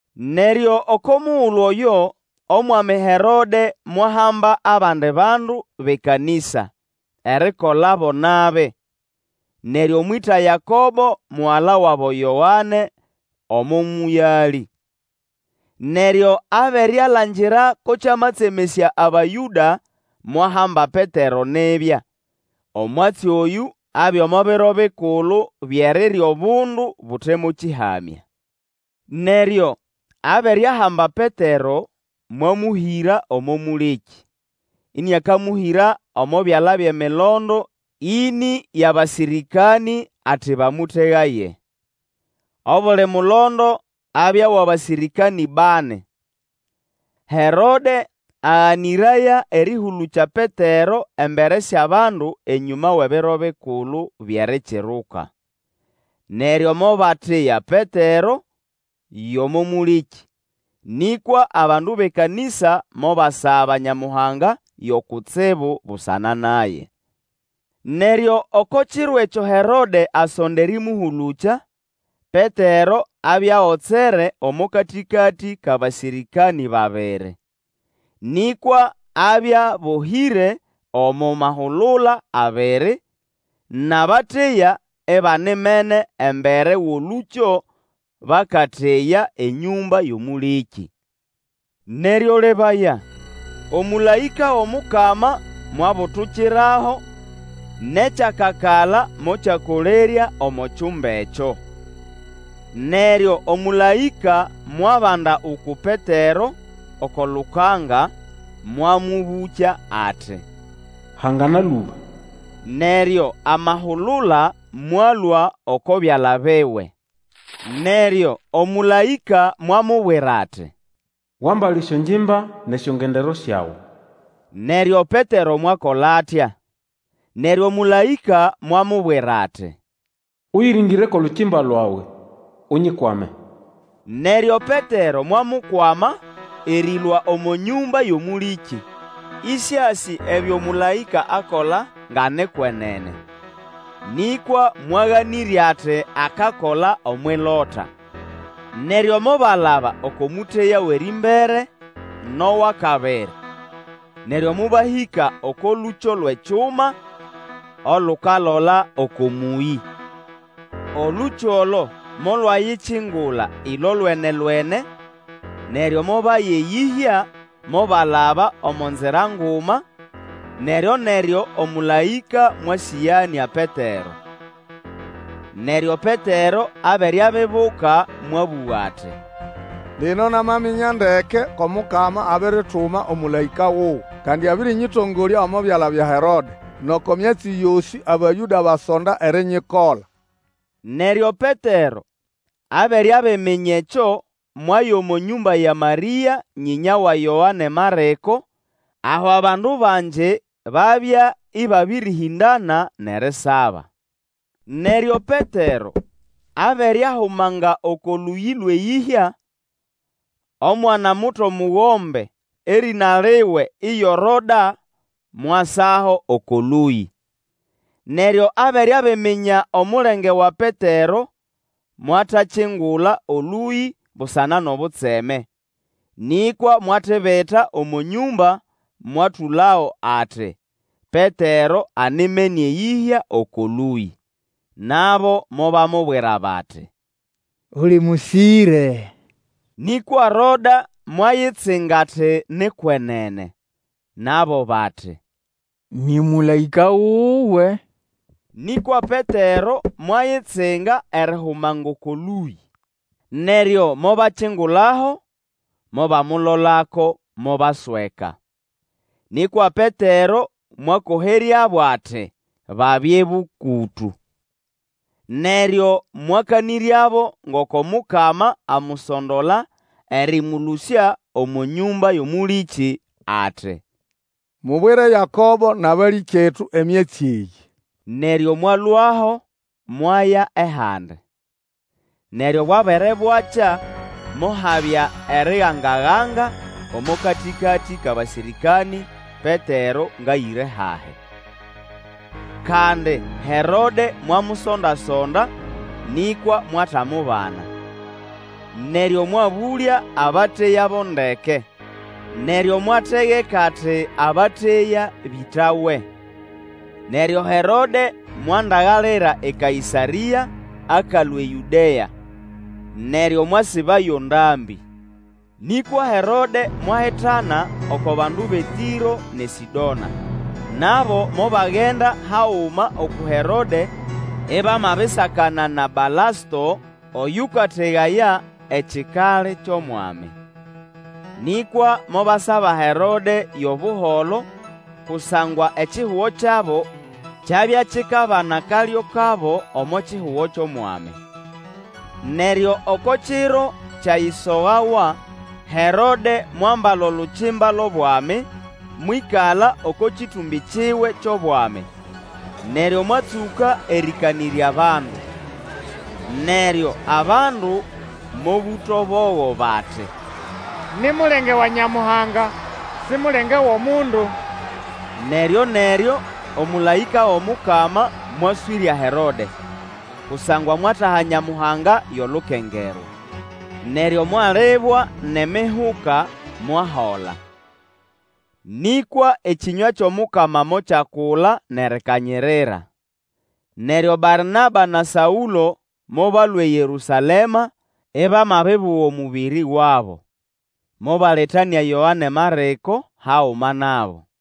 Neryo oko mugulu oyo omwami Herode mwahamba abandi bandu bʼekanĩsa, erikola bo nabi. Neryo mwĩta Yakobo mugala wabo Yoane omo mũyalĩ. Neryo abere alangira ko kyamatsemesya Abayũda, mwahamba Petero nibya. Omwatsi oyũ abya omo Biro Bikulu byʼErirya Obundu Bute mo Kĩhamya. Neryo abere ahamba Petero, mwamũhĩra omo mũlĩkĩ, ĩnĩakamũhĩra omo byala byʼemilondo ĩnĩ yʼabasĩrĩkanĩ ati bamũtegaye. Obuli mulondo abya wʼabasĩrĩkanĩ bani. Herode aganĩraya erĩhũlũkya Petero embere syʼabandu enyũma wʼEbiro Bikulu byʼErikiruka. Neryo mobateya Petero yʼomo mũlĩkĩ, nĩkwa abandu bʼekanĩsa mobasaba Nyamuhanga yo kutsibu busana naye. Neryo oko kiro ekyo Herode asonda erĩmũhũlũkya, Petero abya agotsere omo katĩkatĩ kʼabasĩrĩkanĩ babiri. Nĩkwa abya abohĩre omo mahulula abiri, nʼabateya ibanimene embere wʼolũkyo bakateya enyũmba yʼomũlĩkĩ. Neryo lebaya, omũlaĩka wʼomukama mwabulukirabo, nʼekyakakala mokyakolerya omo kyumba ekyo. Neryo omũlaĩka mwabanda uku Petero oko lukanga, mwamũbũkya ati, Hangana lũba! Neryo amahulula mwalũa oko byala biwe. Neryo omũlaĩka mwamubwira ati, wambale esyongimba nʼesyongendero syawe. Neryo Petero mwakola atya. Neryo omũlaĩka mwamubwira ati, Ũyĩrĩngĩre kwʼolukimba lwawe, Unyikwame! Neryo Petero mwamukwama erĩlũa omo nyũmba yʼomũlĩkĩ, ĩsĩasĩ ebyo mũlaĩka akola nga ni kwenene, nĩkwa mwaganĩrya ati akakola omwʼilota. Neryo mobalaba oko mũteya wʼerĩmbere, nʼowʼakabiri, neryo mobahĩka oko lũkyo lwʼekyuma olukalola oko mũyĩ. Olũkyo olo molwayikingula ĩlolwenelwene, neryo mobaya eyĩhya mobalaba omo nzira nguma, neryo-neryo omũlaĩka mwasĩganĩa Petero. Neryo Petero abere abibuka mwabũga ati, Lino namaminya ndeke ko Mukama abirituma omũlaĩka wuwe. Kandi abĩrĩnyĩtongolya omo byala bya Herode, nʼoko myatsi yosĩ Abayũda basonda erinyikola. Neryo Petero abere abiminya ekyo, mwaya omo nyũmba ya Marĩa, nyĩnya wa Yoane Marĩko, aho abandu bangi babya ĩbabĩrĩhĩndana nʼerisaba. Neryo Petero abere ahumanga oko lũyĩ lwʼeyĩhya, omwana-muto mugombe erĩna liwe iyo Roda mwasaho oko lũyĩ. Neryo abere abiminya omulenge wa Petero, mwatakingula Olũyĩ busana nʼobutseme, nĩkwa mwatibita omo nyũmba mwatũlago ati, Petero animene eyĩhya oko lũyĩ. Nabo mobamubwira bati, Uli mũsĩre! Nĩkwa Roda mwayitsinga ati ni kwenene. Nabo bati, nĩ mũlaĩka wuwe! Nĩkwa Petero mwayitsinga erihumanga oko lũyĩ. Neryo mobakingulaho, mobamulolako, mobasweka. Nĩkwa Petero mwakoheryabo ati babye bũkũtũ, neryo mwakanĩryabo ngoko Mukama amusondola erĩmũlũsya omo nyũmba yʼomũlĩkĩ. Ati, Mubwire Yakobo nʼabalĩkyetu emyatsi eyĩ. Neryo mwalũaho mwaya ehandi. Neryo bwabere bwakya, mohabya eriganga-ganga omo katĩkatĩ kʼabasĩrĩkanĩ Petero ngʼayĩre hahi. Kandi Herode mwamusonda-sonda, nĩkwa mwatamubana. Neryo mwabũlya abateya bo ndeke, neryo mwategeka ati abateya bĩtawe. Neryo Herode mwandagalira eKaĩsarĩa akalũa eYũdea, neryo mwasibayo ndambĩ. Nĩkwa Herode mwahitana oko bandu bʼeTĩro nʼeSĩdona. Nabo mobagenda haguma uku Herode ibamabisakana na Balasto ayũkategaya ekikali kyʼOmwami. Nĩkwa mobasaba Herode yʼobuholo kusangwa ekihugo kyabo kyabya kikabana akalyo kabo omo kihugo kyʼOmwami. Neryo oko kiro kyayisogawa, Herode mwambala olukimba lwʼobwami, mwĩkala oko kĩtũmbĩ kiwe kyʼobwami, neryo mwatsũka erĩkanĩrya bandu. Neryo abandu mobũta obogo bati, Ni mulenge wa Nyamuhanga, si mulenge wʼomundu! Neryo-neryo omũlaĩka wʼomukama mwaswĩrya Herode, kusangwa mwataha Nyamuhanga yʼolukengerwa. Neryo mwalibwa nʼemihuka, mwahola. Nĩkwa ekĩnywa kyʼomukama mokyakula nʼerikanyirira. Neryo Barnaba na Saũlo mobalũa eYerũsalema, ibamabibuga omũbĩrĩ wabo. Mobaletanĩa Yoane Marĩko haguma nabo.